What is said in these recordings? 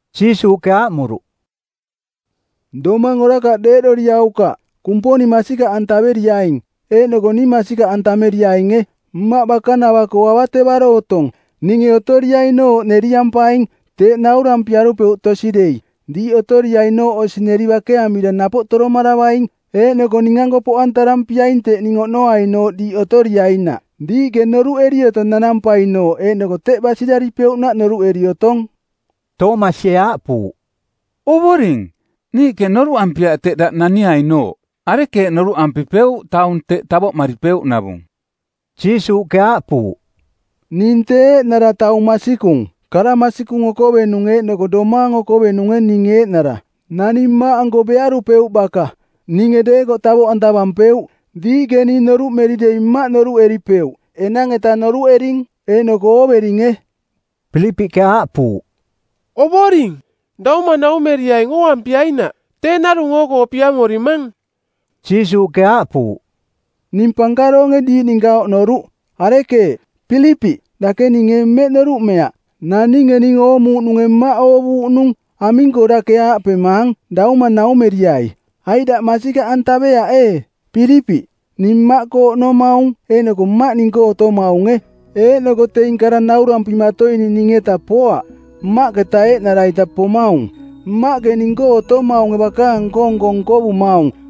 Jiisuuꞌke aaꞌmuruꞌ, “Domang orakaꞌ deeꞌdoriaukaꞌ. Kumponing masikaꞌantaveriaing, eeꞌnoko ning masikaꞌantameriainge. Mmaꞌ bakanava-koo avatevaro otong. Ninge otoriainooꞌ neriampaing. Teeꞌ naurampiarupeuꞌ tosi dei. Diiꞌ otoriainooꞌ osi neri bakeamira napoꞌ toromaravaing, eeꞌnoko ning-anko poꞌantarampiaing teꞌ ning oꞌnoainooꞌ diiꞌ otoriainaꞌ. Diiꞌke noruꞌeri otong nanampainooꞌ eeꞌnoko teꞌ basiraripeuꞌnaꞌ noruꞌeri otong.” Toomasie aaꞌpuuꞌ, “Ovoring, niiꞌke noruꞌampiaꞌ teꞌ daꞌ naniainooꞌ. Arekeeꞌ noruꞌampipeuꞌ taung teꞌ tavoꞌmaripeuꞌnavung?” Jiisuuꞌke aaꞌpuuꞌ, “Ning tee eeꞌnara taung masikung, kara masikung okovenung eeꞌnoko domaang okovenunge ning eeꞌnara. Naning Mmaꞌanko bearupeuꞌ baka. Ninge deekoꞌ tavoꞌantavampeuꞌ. Diiꞌke ning noruꞌmeri dei Mmaꞌ noruꞌeripeuꞌ; enang-eta noruꞌering, eeꞌnoko ooveringe.” Pilipiꞌke aaꞌpuuꞌ, “Ovoring, Dauma naumeriaing ooampiainaꞌ. Tee narung oo-koo piamorimang.” Jiisuuꞌke aaꞌpuuꞌ, “Ning pankaroonge diiꞌ ninka oꞌnoruꞌ. Arekeeꞌ, Pilipiꞌ, dake ning ee mmeꞌ noruꞌmeaꞌ? Naninge ning oomuuꞌnunge Mmaꞌ oovuuꞌnung. Aming-koo dake aaꞌpemaang, ‘Dauma naumeriai?’ Aiꞌ daꞌ masikaꞌantaveaꞌ ee, Pilipiꞌ, ning Mmaꞌkoo oꞌnomaung eeꞌnoko Mmaꞌ ning-koo otomaunge? Eeꞌnoko teing kara naurampimatoining ning-eta poaꞌ. Mmaꞌketa eeꞌnara-ita pomaung. Mmaꞌke ning-koo otomaunge bakaang nko-nko nkovumaung.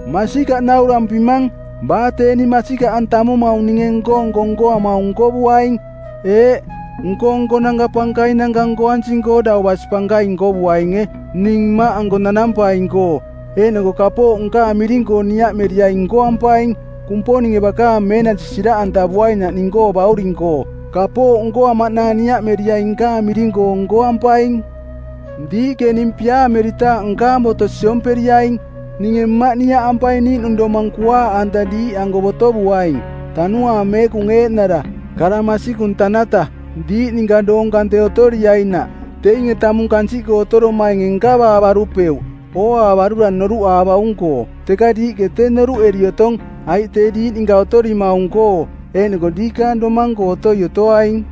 Masikaꞌ naurampimang, baa tee ning masikaꞌantamumaung ninge nko-nko nkoamaung nkovuaing. Eeꞌ, nko-nkonanka pankainanka nkoansing-koo dau basi pankaing nkovuainge, ning Mmaꞌanko nanampaing-koo. Eeꞌnoko kapooꞌ nkaang miring-koo niaꞌmeriaing nkoampaing, Kumponinge bakaang meenasi siraꞌantavuainaꞌ ning-koo Bauring-koo. Kapooꞌ nkoamaꞌnaang niaꞌmeriaing nkaang miring-koo nkoampaing.” “Diiꞌke ning piaameritaaꞌ nkaang boto siomperiaing. Ninge Mmaꞌ niaꞌampaing niiꞌnung domang kuaaꞌanta diiꞌanko botovuaing, Tanuaang Meekung eeꞌnara, kara masikung tanata, diiꞌ ninka doong kante otoriainaꞌ. Teinge tamung kansiꞌkoo otoromainge nkavaavarupeuꞌ, ooaavarura noruꞌaavaung-koo. Teka diiꞌke tee noruꞌeri otong, aiꞌ tee diiꞌ ninka otorimaung-koo; eeꞌnoko diikaang domang-koo otoi otoaing.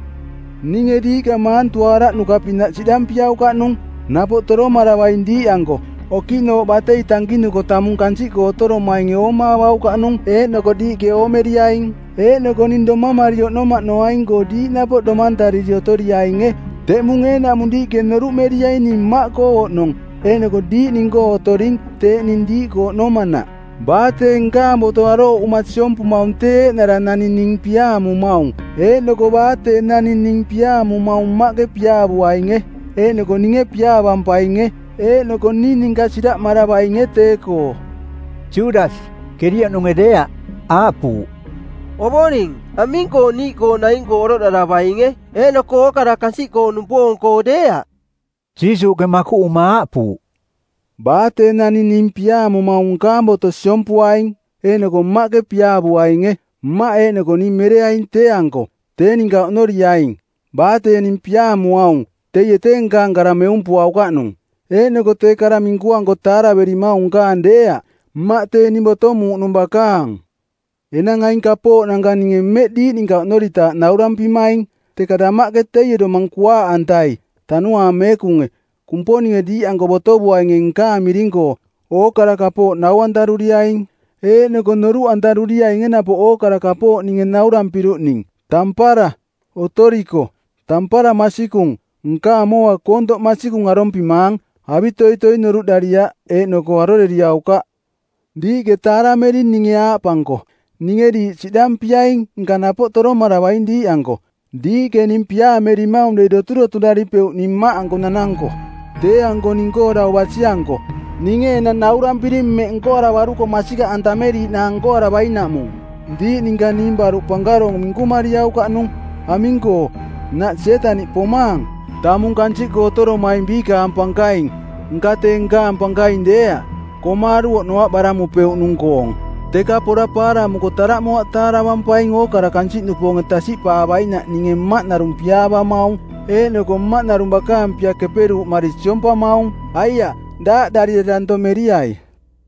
Ninge diiꞌka maantuaaraꞌnuka-pinaꞌ siꞌdampiaukaꞌnung. Napoꞌ toromaravaing diiꞌanko. Okiꞌnooꞌ batei tankinuko tamung kansiꞌkoo otoromainge oomaavaukaꞌnung eeꞌnoko diiꞌke oomeriaing. Eeꞌnoko ning domamari oꞌnomaꞌnoaing-koo diiꞌ napoꞌ domantariri otoriainge. Teꞌmung eeꞌnaꞌmung diiꞌke noruꞌmeriaing ning Mmaꞌkoo oꞌnong eeꞌnoko diiꞌ ning-koo otoring teeꞌ ning diiꞌkoo oꞌnomanaꞌ. “Baa tee nkaang boto arooꞌuma siompumaung tee eeꞌnara naning ning piaamumaung. Eeꞌnoko baa tee naning ning piaamumaung Mmaꞌke piaavuainge. Eeꞌnoko ninge piaavampainge. Eeꞌnoko ning ninka siraꞌmaravainge tee-koo.” Judasi, Kerioꞌnunge deeaꞌ, aaꞌpuuꞌ, “Ovoring, aming-koo niiꞌkoo naing-koo oroꞌdaravainge eeꞌnoko ookara kansiꞌkoo-nupoong-koo deeaꞌ?” Jiisuuꞌke makuꞌuma aaꞌpuuꞌ, “Baa tee naning ning piaamumaung nkaang boto siompuaing. Eeꞌnoko Mmaꞌke piaavuainge. Mmaꞌ eeꞌnoko ning mereaing tee-anko; tee ninka oꞌnoriaing. Baa tee ning piaamuaung, teie tee nkaang kara meumpuaukaꞌnung. Eeꞌnoko tee kara minkuanko taaraverimaung nkaang deeaꞌ, Mmaꞌ tee ning botomuuꞌnung bakaang. “Enang aing kapooꞌnanka ninge mmeꞌ diiꞌ ninka oꞌnoritaaꞌ naurampimaing. Teka damaꞌke teie Domang Kuaaꞌantai, Tanuaang Meekunge, Kumponinge diiꞌanko botovuainunge nkaang miring-koo, ookara kapooꞌ nau-antaruriaing, eeꞌnoko noruꞌantaruriainge napoꞌ ookara kapooꞌ ninge naurampiruꞌning. “Tampara, otoriko. Tampara masikung, nkaang mooa koontoꞌ masikung arompimaang. Avitoitoi noruꞌdariaꞌ eeꞌnoko aroreriaukaꞌ. Diiꞌke taaramering ninge aaꞌpanko, ‘Ninge diiꞌ siꞌdampiaing nka napoꞌ toromaravaing diiꞌanko.’ Diiꞌke ning piaamerimaung dei doturoturaripeuꞌ ning Mmaꞌanko nananko, tee-anko ning-koo dau basi-anko. Ninge enang naurampiring mmeꞌ nkoaravaruko masikaꞌantameriiꞌnaang nkoaravainaꞌmung. Diiꞌ ninka ning baruꞌ pankaroong minkumariaukaꞌnung. Aming-koo, nnaꞌ Sietaniꞌ pomaang, tamung kansiꞌkoo otoromaing biikaang pankaing. Nka tee nkaang pankaing deeaꞌ. Komaaru˜ oꞌnoaꞌ baramupeuꞌnung-koong. Teka pora paaramuko taraꞌmoaꞌ taaravampaing ookara kansiꞌnupoonge tasiꞌpaavainaꞌ ninge Mmaꞌ narung piaavamaung, eeꞌnoko Mmaꞌ narung bakaang pia keperuuꞌmari siompamaung. Aiaꞌ, daaꞌdarira danto meriai.”